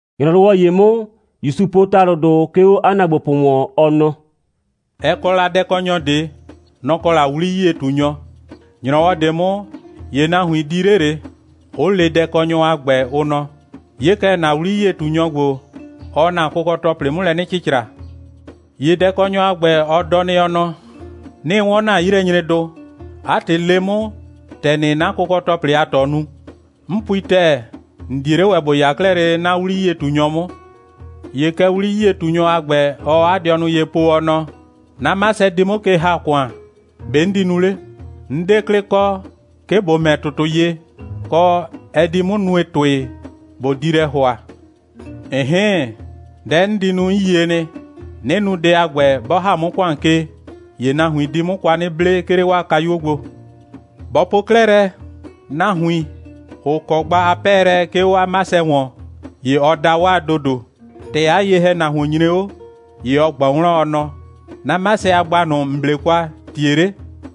‑Nyrɔwɔ ‑ye 'mʋ, ‑Yusu po ‑talʋdʋ, 'ke 'o 'a ‑naagbopʋ ‑wɔn, ɔ nɔ: «Ɛ kɔ la dɛkɔnyɔ ꞊de. Nɔ‑ kɔ la 'wli'yie꞊tunyɔ. ‑Nyrɔwɔ ꞊de 'mʋ, ‑ye nahuin di 'le ꞊le, 'ʋ le dɛkɔnyɔ a ‑gbɛ, ʋ nɔ: 'Ye kɛ, ‑na 'wli'yie꞊tunyɔ ‑gbo, ɔɔ ‑na kʋkɔ‑tɔplɩ 'mʋ lɛ 'nɩ cɩcra. ‑Ye dɛkɔnyɔ a ‑gbɛ, ɔ dɔ nɩ, ɔ nɔ: 'Nɩɩ 'wɔn ‑na 'yilɛnyredʋ. 'A ‑tɩ, le 'mʋ, ‑tɛ ‑nɩɩ 'na kʋkɔ‑tɔplɩ a ꞊tɔ nu. 'N pui ‑tɛɛ, ‑n 'die 'le ‑wɛ ‑bo 'ya 'klɛɛ lele 'na 'wli'yie꞊tunyɔ 'mʋ. ‑Ye kɛ 'wli'yie꞊tunyɔ a ‑gbɛ, ɔɔ 'a dɩɔnʋ ye po, ɔ nɔ: 'Na 'masɛ di 'mʋ ke ‑ha ‑kʋan. ‑Be' 'n di nu 'le? 'N 'de 'klɩ kɔ, 'ke ꞊bo ‑mɛ ‑tʋtʋ ye, kɔ, ɛ di 'mʋ nue ‑tʋɩ, ꞊bo di lɛ ‑hʋa. ‑Ɩn'hɩɩn, dɛ 'n di nu, 'n yie nɩ. 'Nɩ nu dɛ a ‑gbɛ, 'bɔ ‑ha 'mʋ ‑kʋan ke, ‑ye nahuin di 'mʋ kwa 'nɩ 'ble, 'ke 'le 'waa kayuo gbo. Bɔ po 'klɛɛ lɛ, nahuin, ‑ʋ kɔ gba a 'pɛɛlɛ, 'ke 'o 'a 'masɛ ‑wɔn, ‑ye ɔ da 'waa ‑dodo. ‑Tɛ 'a ye‑hɛnahuon nyre 'o, ‑ye ɔ ꞊gbɔ wlɔn, ɔ nɔ: 'Na 'masɛ a gba ꞊nʋ, ‑n 'ble kwa, ‑tie 'le?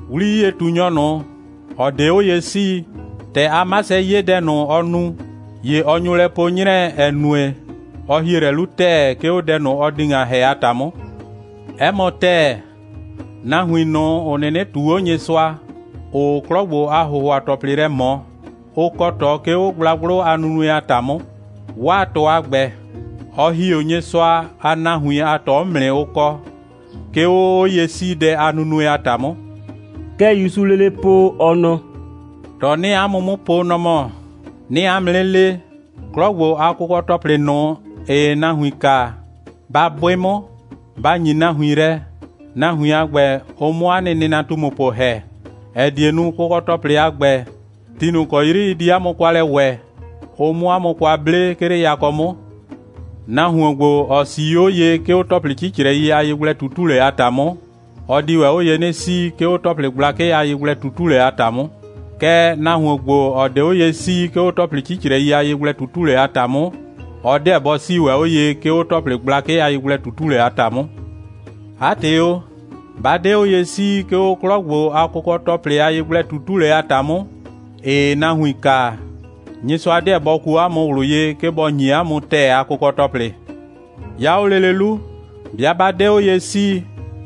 'Wli'yie꞊tunyɔ ꞊nʋ, ‑ɔ 'de 'o ye 'sii, ‑tɛ 'a 'masɛ 'ye dɛ ꞊nʋ, ɔ nu, ‑ye ɔ nyo lɛ po 'nyrɛɛ, ‑ɛ nue, ɔ ‑hie lɛ 'lu ‑tɛɛ, 'ke 'o dɛ ꞊nʋ, ɔ di ‑ŋa ‑hɛ a ‑ta 'mʋ. 'Ɛ mɔ ‑tɛɛ, nahuin ꞊nʋ, ‑ʋ 'nɩnɩ ꞊tuu 'o Nyɩsʋa, ‑ʋʋ 'klɔ ‑gbo a ‑hʋhʋa‑tɔplɩ lɛ ꞊mɔ, ʋ kɔ ꞊tɔ, 'ke 'o gblagblʋ a nunue a ‑ta 'mʋ. 'Waa ꞊tɔ a ‑gbɛ, ɔ ‑hi 'o Nyɩsʋa a nahuin a ꞊tɔ 'mʋ nɩ, ʋ kɔ, 'ke 'o 'oye'siidɛ a nunue a ‑ta 'mʋ.» Kɛ ‑Yusuu lele po, ɔ nɔ: «꞊Tɔ 'nɩɩ 'a mʋ 'mʋ po, nɔ‑ mɔ: 'Nɩɩ 'a mʋ 'nɩ le, 'klɔ ‑gbo a kʋkɔ‑tɔplɩ ꞊nʋ, ‑ɩɩ nahuin kaa, ba 'bʋɩ 'mʋ, ba ‑nyi nahuin lɛ, nahuin a ‑gbɛ, ʋ 'mʋ 'a nɩ nɩnatumupʋ ‑hɛ, ‑ɛ die nu, kʋkɔ‑tɔplɩdʋ a ‑gbɛ, ti ꞊nʋ ‑kɔ 'yri ɩ di 'a mʋ kwa lɛ ‑wɛ, ʋ 'mʋ 'a mʋ kwa 'ble, 'ke 'le yakɔ 'mʋ. Nahuon ‑gbo, ‑ɔ 'sii 'o ye, 'ke 'o ‑tɔplɩ 'cicrɛi a yegblɛ꞊tutulɛ a ‑ta 'mʋ, ɔ di ‑wɛ 'o ye 'nɩ 'sii, 'ke 'o ‑tɔplɩ gblakɩ a yegblɛ꞊tutulɛ a ‑ta 'mʋ. Kɛɛ, nahuon ‑gbo, ‑ɔ 'de 'o ye 'sii, 'ke 'o ‑tɔplɩ 'cicrɛi a yegblɛ꞊tutulɛ a ‑ta 'mʋ, ɔ 'deɛ bɔ 'sii ‑wɛ 'o ye, 'ke 'o ‑tɔplɩ gblakɩ a yegblɛ꞊tutulɛ a ‑ta 'mʋ. 'A ‑tɩ o, 'ba 'de 'o ye 'sii, 'ke 'o 'klɔ ‑gbo a kʋkɔ‑tɔplɩ a yegblɛ꞊tutulɛ a ‑ta 'mʋ, ‑ɩɩ nahuin kaa, Nyɩsʋa 'deɛ bɔ kuo 'a mʋ ꞊wlʋ ye, 'ke bɔ ‑nyi 'a mʋ ‑tɛɛ a kʋkɔ‑tɔplɩ. 'Ya 'o lele 'lu, 'bɩa 'ba 'de 'o ye 'sii,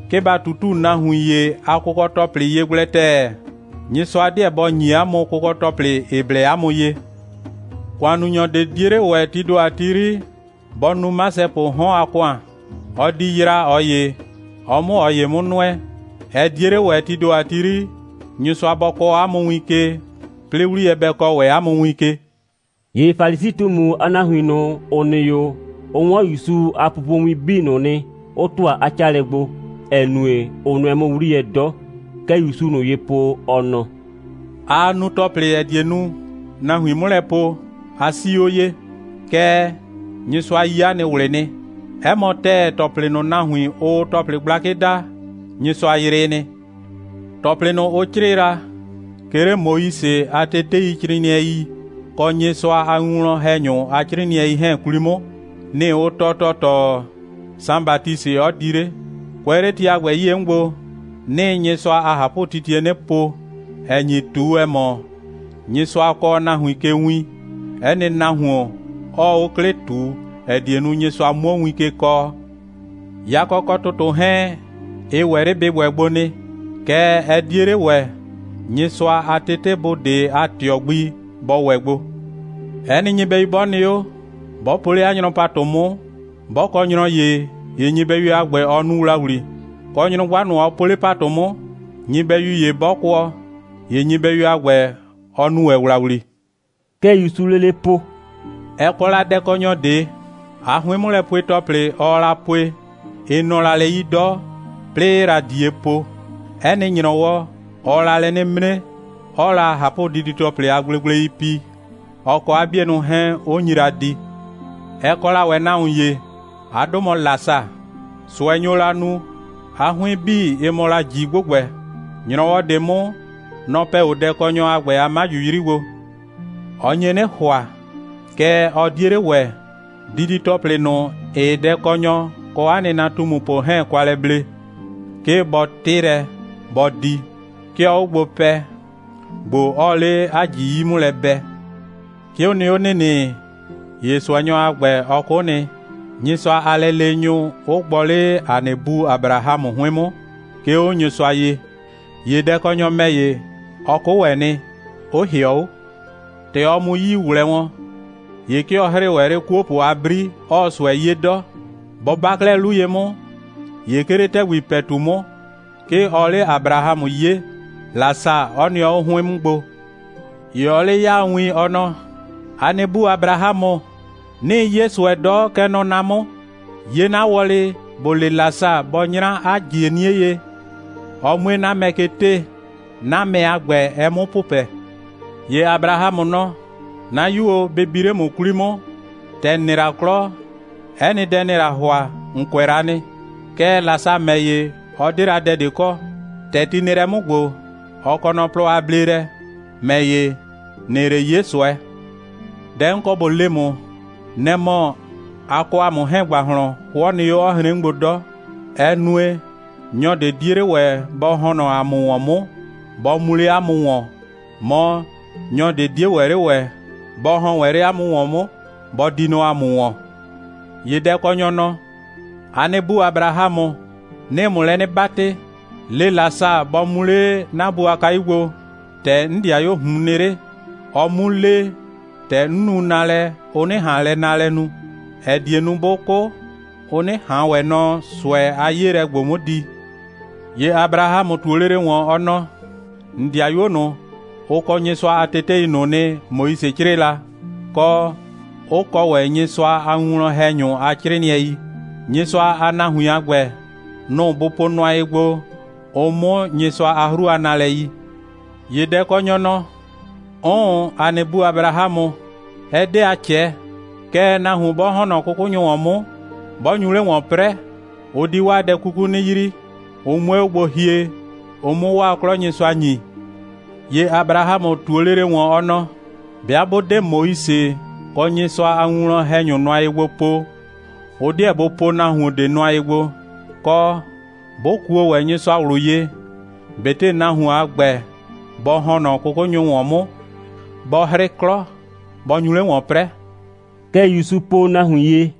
'ke ba ꞊tutu nahuin ‑ye a kʋkɔ‑tɔplɩ ye gblɛ ‑tɛɛ, Nyɩsʋa 'deɛ bɔ ‑nyi 'a mʋ kʋkɔ‑tɔplɩ, ‑ɩ blɛ 'a mʋ ye. ‑Kʋannunyɔ ꞊de 'die 'le ‑wɛ, tii ‑do 'yri, bɔ nu 'masɛpʋʋ 'hɔn a ‑kʋan. Ɔ di yraa ꞊ɔ ‑ye, ɔ 'mʋ ꞊ɔ ‑ye 'mʋ nʋɛ. Ɛ 'die 'le ‑wɛ, tii ‑do 'yri, Nyɩsʋa bɔ kɔɔ 'a mʋ win ke, 'plɩɩ 'wliyɛ bɛ kɔɔ ‑wɛ 'a mʋ win ke.» ‑Ye Falisi꞊tumu a nahuin ꞊nʋ, ‑ʋ nɩ 'o, ʋ 'wɔn ‑Yusu a pupowin 'bii ꞊nʋ nɩ, 'ʋ ‑tʋa 'a 'caalɛ gbo, ‑ɛ nue, ʋ nʋɛ 'mʋ 'wliyɛ 'dɔ. Kɛ ‑Yusuu ꞊nʋ ye po, ɔ nɔ: «Aa nu ‑tɔplɩ, ‑ɛ die nu, nahuin 'mʋ lɛ po: A 'sii 'o ye. Kɛɛ, Nyɩsʋa yi 'a nɩ ꞊wlɩ nɩ. 'Ɛ mɔ ‑tɛɛ, ‑tɔplɩ ꞊nʋ, nahuin, ʋʋ ‑tɔplɩ gblakɩ daa, Nyɩsʋa yrɩɩ nɩ. ‑Tɔplɩ ꞊nʋ, ʋ 'crɩɩ la, 'ke 'le Moise a teteicrɩɩnɩɛi kɔ Nyɩsʋa a winwlɔn‑hɛnyʋ a 'crɩɩnɩɛi 'hɛɛn 'kwli 'mʋ, nɩ‑ ʋ tɔɔ ‑tɔɔtɔɔ, Saan Batisɩ 'ɔ di 'le. Kʋɛ 'le ti a ‑gbɛ 'yie 'mʋ gbo, 'nɩɩ Nyɩsʋa a ꞊hapʋtitie 'nɩ po, ‑ɛ nyi ꞊tu, ‑ɛ mɔ, Nyɩsʋa kɔɔ nahuin ke win, 'ɛ nɩ nahuon 'ɔɔ 'o 'klɩ ꞊tu, ‑ɛ die nu, Nyɩsʋa 'muo win ke kɔɔ. Yakɔ kɔ ‑tʋtʋ 'hɛɛn, ɩ ‑wɛ 'le bɩ ‑wɛ gbo nɩ, kɛɛ, ɛ 'die 'le ‑wɛ, Nyɩsʋa a tetebʋ ꞊de a ꞊tɩɔ gbi bɔ ‑wɛ gbo. 'Ɛ nɩ nyɩbɛyu 'bɔ nɩ 'o, 'bɔ po 'le 'a nyrɔ ‑patʋ 'mʋ, 'bɔ kɔ nyrɔ ‑ye, ‑ye nyɩbɛyu a ‑gbɛ, ɔ nu ‑wlawli. Kɔ, nyrʋgba ꞊nʋ, ɔ po 'le ‑patʋ 'mʋ, nyɩbɛyu ‑ye 'bɔ kʋɔ, ‑ye nyɩbɛyu a ‑gbɛ, ɔ nu ‑wɛ ‑wlawli.» Kɛ ‑Yusuu lele po: «Ɛ kɔ la dɛkɔnyɔ ꞊de. 'A 'hʋɩn'mʋlɛpue‑tɔplɩ, ɔɔ la pue, ɩ nɔ la lɛ 'yi 'dɔ, 'plɩɩ 'ɩɩ la ꞊die po. 'Ɛ nɩ ‑nyrɔwɔ, ɔɔ la lɛ 'nɩ 'mre, 'ɔɔ la ꞊hapʋdidi‑tɔplɩ a gblegblei pi, ɔ kɔ 'a 'bienʋ 'hɛɛn, 'ʋ nyi la di. Ɛ kɔ la ‑wɛ nahuon ‑ye. 'A 'dʋ mɔ Lasa. ꞊Sʋɛ nyo la nu, 'a 'hʋɩn 'bii 'ɩ mɔ la ꞊ji ‑gbʋgbɛ. ‑Nyrɔwɔ ꞊de 'mʋ, nɔ‑ pɛ 'o dɛkɔnyɔ a ‑gbɛ a 'maju 'yri gbo. Ɔ nye 'nɩ ‑hʋa, kɛɛ, ɔ 'die 'le ‑wɛ, didi‑tɔplɩ ꞊nʋ, ‑ɩɩ dɛkɔnyɔ kɔ 'a nɩnatumupʋ 'hɛɛn kwa lɛ ble, 'ke bɔ 'tɩ lɛ, bɔ di. 'Ke ɔɔ 'o gbo pɛ, ‑gbo 'ɔɔ 'le 'a ꞊ji 'yi 'mʋ lɛ bɛ. 'Ke ʋ nɩ 'o ‑nɩnɩ, ‑ye ꞊sʋɛnyɔ a ‑gbɛ, ɔ 'kʋ nɩ, Nyɩsʋa a lɛleenyʋ 'ʋ gbɔ 'le ‑a nɩ bu Abrahamʋ 'hʋɩn 'mʋ, ('ke 'o Nyɩsʋa ye). ‑Ye dɛkɔnyɔ ‑mɛ ‑ye, ɔ 'kʋ ‑wɛ nɩ, 'ʋ ‑hɩɔ 'o. ‑Tɛ ɔ mu 'yii ꞊wlɛɛ wɔn, ‑ye 'ke ɔ 'hrɩɩ ‑wɛ 'le 'kuopʋ a 'bri, 'ɔɔ ꞊sʋɛ 'ye 'dɔ. Bɔ 'ba 'klɛɛ 'lu ye 'mʋ, ‑ye 'ke 'le ‑tɛgbi ‑pɛtu 'mʋ, 'ke ɔɔ 'le Abrahamʋ 'yee, Lasa 'ɔ nɩɔ 'o 'hʋɩn 'mʋ gbo. ‑Ye ɔɔ 'le 'yaa win, ɔ nɔ: ‑A nɩ bu Abrahamʋ, 'nɩɩ 'ye ꞊sʋɛ 'dɔ, kɛ nɔ na 'mʋ. 'Ye 'na wɔlɩ, ‑bo le Lasa, bɔ 'nyra 'a ‑jie 'nie ye, ɔ 'mue 'o 'na mɛ ke 'tee, 'na mɛ a ‑gbɛ, ɛ 'mʋ pʋpɛ. ‑Ye Abrahamʋ nɔ: 'Na 'yu o, bɩ bi 'le ‑mʋ 'kwli 'mʋ, ‑tɛ ‑n nɩ la 'klɔ, 'ɛ nɩ dɛ, ‑nɩɩ la ‑hʋa, ‑n kʋɛ la nɩ. Kɛɛ, Lasa ‑mɛ ‑ye, ɔ 'de la dɛ ꞊de kɔ. ‑Tɛ ti nɩ lɛ 'mʋ ‑gbo, ɔ kɔ nɔ plɔ a bleelɛ, ‑mɛ ‑ye, ‑nɩɩ 'le 'ye ꞊sʋɛ. Dɛ 'n kɔ ꞊bo le ‑mʋ, nɛ‑ mɔ, a kɔ ‑a mʋ 'hɛɛn ‑gbahlɔn 'hʋɔ nɩ 'o, 'ɔ hren 'mʋ gbo 'dɔ. Ɛ nue, nyɔ ꞊de 'die ‑wɛ 'le ‑wɛ bɔ ‑hɔn nɔ ‑a mʋ ‑wɔn 'mʋ, bɔ mu 'le 'a mʋ ‑wɔn, mɔ, nyɔ ꞊de 'die ‑wɛ 'le ‑wɛ bɔ ‑hɔn ‑wɛ 'le 'a mʋ ‑wɔn 'mʋ, bɔ di nɔ ‑a mʋ ‑wɔn. ‑Ye dɛkɔnyɔ nɔ: ‑A nɩ bu Abrahamʋ, 'nɩɩ ‑mʋ lɛ 'nɩ 'batɩ, le Lasa, bɔ mu 'le 'na bu a kayu gbo, ‑tɛ 'n 'dɩayuoo ꞊hun nɩ 'le, ɔ 'mu le, ‑tɛ 'n nu naalɛ, ʋ 'nɩ ꞊han lɛ naalɛ nu, ‑ɛ die nu, 'bʋ 'kʋ, ʋ 'nɩ ꞊han ‑wɛ nɔ ꞊sʋɛ a 'yeelɛ ‑gbo 'mʋ di. ‑Ye Abrahamʋ ꞊tuo lele ‑wɔn, ɔ nɔ: ‑N ‑dɩayuo ꞊nʋ, ʋ kɔ Nyɩsʋa a tetei ꞊nʋ nɩ, Moise 'crɩɩ la, kɔ, 'ʋ kɔ ‑wɛ Nyɩsʋa a winwlɔn‑hɛnyʋ a 'crɩɩnɩɛi. Nyɩsʋa a nahuin a ‑gbɛ, nʋ‑ bʋ po nʋa ye gbo, ʋ 'mʋ Nyɩsʋa a 'hru a nalɛ yi. ‑Ye dɛkɔnyɔ nɔ: 'Ʋʋn, ‑a nɩ bu Abrahamʋ, ɛ 'de a ꞊cɛɛ. Kɛɛ, nahuon 'bɔ ‑hɔn nɔ 'kʋkʋnyʋ ‑wɔn 'mʋ, 'bɔ nyu 'le ‑wɔn 'prɛɛ, ʋ di 'waa dɛ 'kuku 'nɩ yrii, ʋ 'mue 'o gbo hie, ʋ 'mʋ 'waa 'klɔ Nyɩsʋa ‑nyi. ‑Ye Abrahamʋ ꞊tuo lele ‑wɔn, ɔ nɔ: 'Bɩa 'bʋ 'de Moise kɔ Nyɩsʋa a winwlɔn‑hɛnyʋ nʋa ye gbo po, ʋ 'deɛ bʋ po nahuon ꞊de nʋa ye gbo, kɔ, bʋ kuo ‑wɛ Nyɩsʋa ꞊wlʋ ye, ꞊betɩ nahuon a ‑gbɛ, bɔ ‑hɔn nɔ 'kʋkʋnyʋ ‑wɔn 'mʋ, bɔ 'hrɩ 'klɔ, bɔ nyu 'le ‑wɔn 'prɛɛ.» Kɛ ‑Yusu po nahuin ye.